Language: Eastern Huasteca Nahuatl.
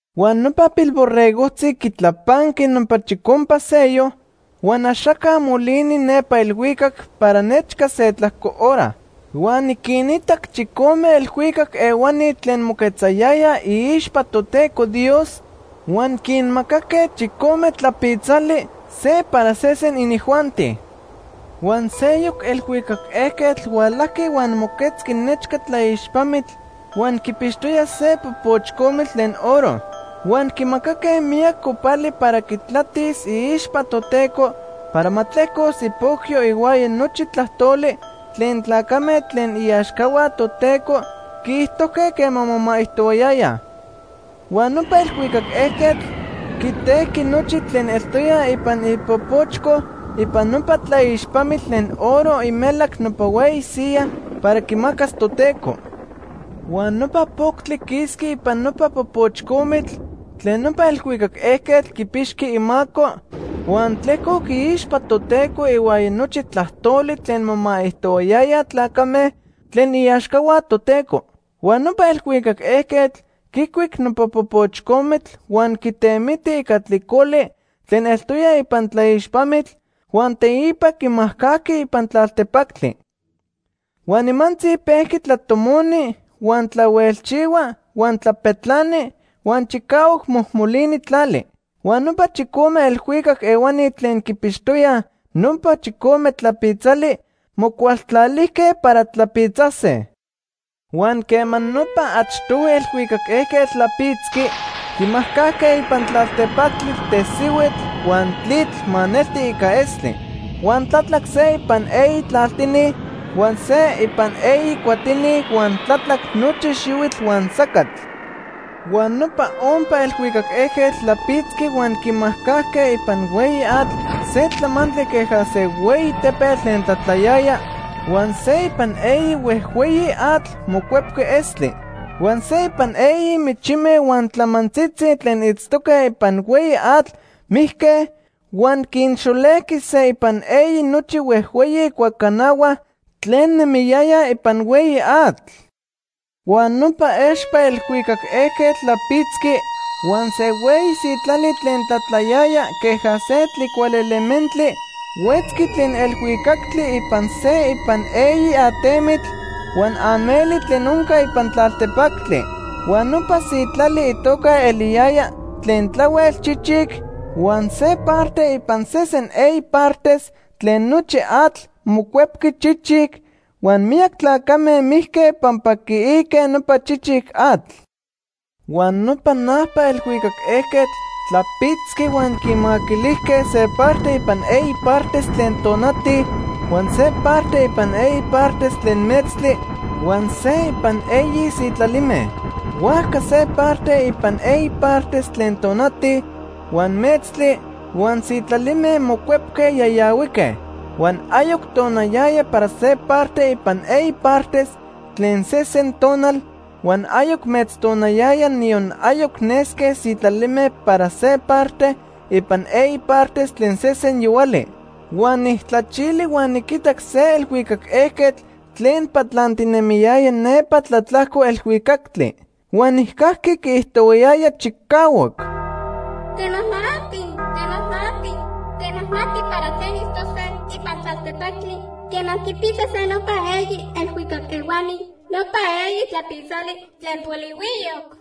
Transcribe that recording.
Huan nopa Pilborregojtzi quitlapanqui nopa chicompa sello, huan axaca molini nepa elhuicac para nechca se tlajco hora. Huan niquinitac chicome elhuicac ehuani tlen moquetzayayaj iixpa Toteco Dios huan quinmacaque chicome tlapitzali, se para sesen inijuanti. Huan seyoc elhuicac ejquetl hualajqui huan moquetzqui nechca tlaixpamitl huan quipixtoya se popoch comitl tlen oro. Huan quimacaque miyac copali para quitlatis iixpa Toteco para ma tlejcos ipocyo ihuaya nochi tlajtoli tlen tlacame tlen iaxcahua Toteco quiijtojque quema momaijtoyayaj. Huan nopa elhuicac ejquetl quitejqui nochi tlen eltoya ipan ipopochco ipan nopa tlaixpamitl tlen oro imelac nopa hueyi siyaj para quimacas Toteco. Huan nopa poctli quisqui ipan nopa popoch comitl tlen nopa elhuicac ejquetl quipixqui imaco, huan tlejcoc iixpa Toteco ihuaya nochi tlajtoli tlen momaijtojtoyaj tlacame tlen iaxcahua Toteco. Huan nopa elhuicac ejquetl quicuic nopa popoch comitl huan quitemiti ica tlicoli tlen eltoya ipan tlaixpamitl, huan teipa quimajcajqui ipan tlaltepactli. Huan nimantzi pejqui tlatomoni, huan tlahuelchihua, huan tlapetlani, huan chicahuac mojmolini tlali. Huan nopa chicome elhuicac ehuani tlen quipixtoyaj nopa chicome tlapitzali mocualtlalijque para tlapitzase. Huan quema nopa achtohui elhuicac ejquetl tlapitzqui, quimajcajque ipan tlaltepactli tesihuitl huan tlitl maneltic ica estli. Huan tlatlac se ipan eyi tlaltini, huan se ipan eyi cuatini, huan tlatlac nochi xihuitl huan sacatl. Huan nopa ompa elhuicac ejquetl tlapitzqui huan quimajcajque ipan hueyi atl se tlamantli queja se hueyi tepetl tlen tlatlayaya, huan se ipan eyi huejhueyi atl mocuepque estli. Huan se ipan eyi michime huan tlamantzitzi tlen itztoque ipan hueyi atl mijque, huan quinxolejqui se ipan eyi nochi huejhueyi cuacanahua tlen nemiyayaj ipan hueyi atl. Huan nopa expa elhuicac ejquetl tlapitzqui huan se hueyi sitlali tlen tlatlayaya queja se tlicualementli huetzqui tlen elhuicactli ipan se ipan eyi atemitl huan ameli tlen onca ipan tlaltepactli. Huan nopa sitlali itoca eliyayaj Tlen Tlahuel Chichic huan se parte ipan sesen eyi partes tlen nochi atl mocuepqui chichic, huan miyac tlacame mijque pampa quiique nopa chichic atl. Huan nopa najpa elhuicac ejquetl tlapitzqui huan quimaquilijque se parte ipan eyi partes tlen tonati, huan se parte ipan eyi partes tlen metztli, huan se ipan eyi sitlalime. Huajca se parte ipan eyi partes tlen tonati, huan metztli, huan sitlalime mocuepque yayahuique. Huan ayoc tonayaya para se parte ipan eyi partes tlen sesen tonal, huan ayoc metztonayaya, niyon ayoc nesque sitlalime para se parte ipan eyi partes tlen sesen yohuali. Huan nijtlachili huan niquitac se elhuicac ejquetl tlen patlantinemiyaya nepa tlatlajco elhuicactli. Huan nijcajqui quiijtohuayaya chicahuac: “¡Temajmati, temajmati, temajmati para tlen itztose ipan tlaltepactli quema quipitzase nopa eyi elhuicac ehuani nopa eyi tlapitzali tlen polihuiyoc!”